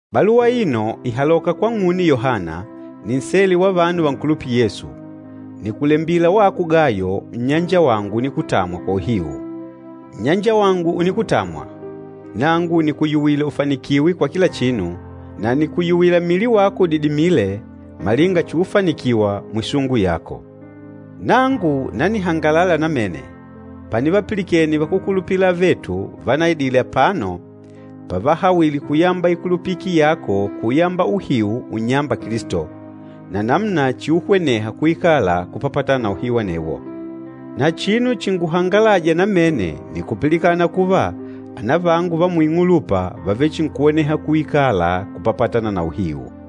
Baluwa aino ìhaloka kwang'une Yohana, ninsele wa vanu vankulupîla Yesu. Nìkulembila wako Gayo, nnyanjawangu unikutamwa kwa uhiu. Nnyanjawangu unikutamwa, nangu nìkuyuwila ufanikiwe kwa kila chinu, na nìkuyuwila mmili wako udidimile malinga chuufanikiwa mwisungu yako. Nangu nanihangalala namene panivapilikene vakúkulupila avetu vanaidile apano pavahawile kuyamba ikulupiki yako kuyamba uhiu unnyâmba Kilisto, na namuna chiuhweneha kuikala kupapatana na uhiu anewo. Na chinu chinguhangalâja namene nni kupilikana kuva, anavangu va muing'ulupa vàvechinkuhweneha kuikala kupapatana na uhiu.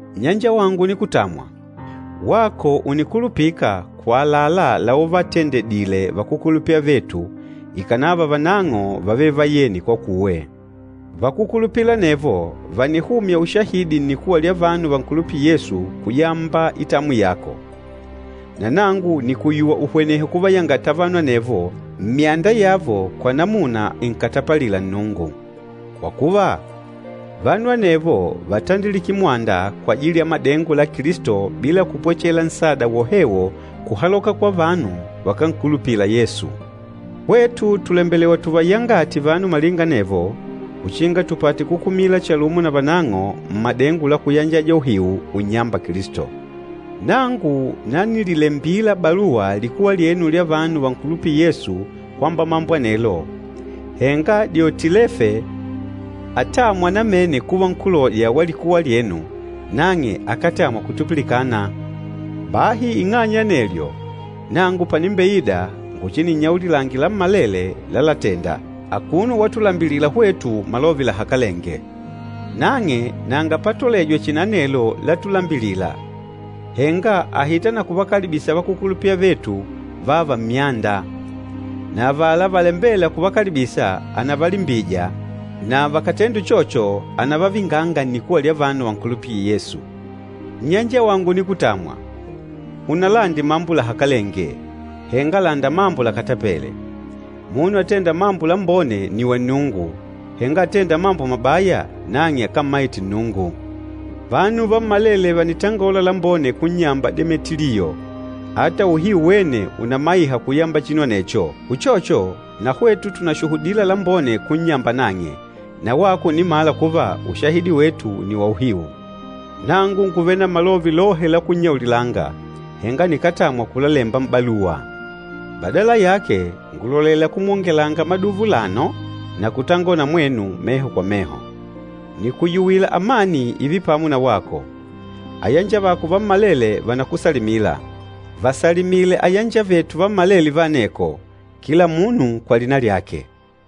Nnyanjawangu unikutamwa, wako ùnikulupika kwa àlalá lauvatendedile vakúkulupila avetu, ikànava vanang'o vávele vayeni kwakuwe. Vakúkulupila anevo vànihumya ushahidi nnikuwa lya vanu vankulupîla Yesu kuyamba itamwi yako. Na nangu nìkuyuwa uhwenehe kuvayangata vanu anevo mmyanda yavo kwa namuna inkatapalîla Nnungu. Kwa kuva, vanu anevo vátandilike mwanda kwajili ya madengo la Kilisto bila kupwechela nsada wohewo kuhaloka kwa vanu vakánkulupila Yesu. Hwetu tùlembelewa tuvayangate vanu malinga anevo uchinga tupate kukumilana chalumo na vanang'o mmadengo la kuyanjaja uhiu unnyâmba Kilisto. Nangu nanililembila baluwa likuwa lyenu lya vanu vankulupîla Yesu kwamba mambo anelo, henga Diotilefe atâmwa namene kuva nkúloja wa likuwa lyenu, nang'e akátamwa kutupilikana. Bahi ing'anya ya anelyo, nangu panimbeida nguchininnyaulilange lammalele lálatèndà, akuno watulambilila hwetu malove lahakalenge. Nang'e nanga patolejwa chihi na anelo látulambilìlà, henga àhita na kuvakalibisa vakúkulupila avetu vààva mmyanda. Na avala valambêla kuvakalibisa, ànavalimbija na vakàtenda uchocho ànavavinganga nnikuwa lya vanu vankulupîla Yesu. Nnyanjawangu unikutamwa, unalande mambo lahakalenge, henga landa mambo lakatapele. Munu atênda mambo lambone nni wa Nnungu, henga atênda mambo mabaya, nang'e akámmaite Nnungu. Vanu vammalele vànitangola lambone kunnyamba Demetiliyo, ata uhiu wene ùnamaiha kuyamba chinu anecho. Uchocho, na hwetu tùnashuhudila lambone kunnyamba nang'e, na wako ùnimala kuva ushahidi wetu nni wa uhiu. Nangu ngùvele na malove lohe la kunnyaulilanga, henga nikátamwa kulalemba m'baluwa. Badala yake, ngùlolela kumwongelanga maduva ulano na kutangola na mwenu meho kwa meho. Nìkuyuwila amani ììve pamo na wako. Ayanjavako vammalele vànakusalimila. Vasalimile ayanjavetu vammalele va aneko, kila munu kwa lina lyake.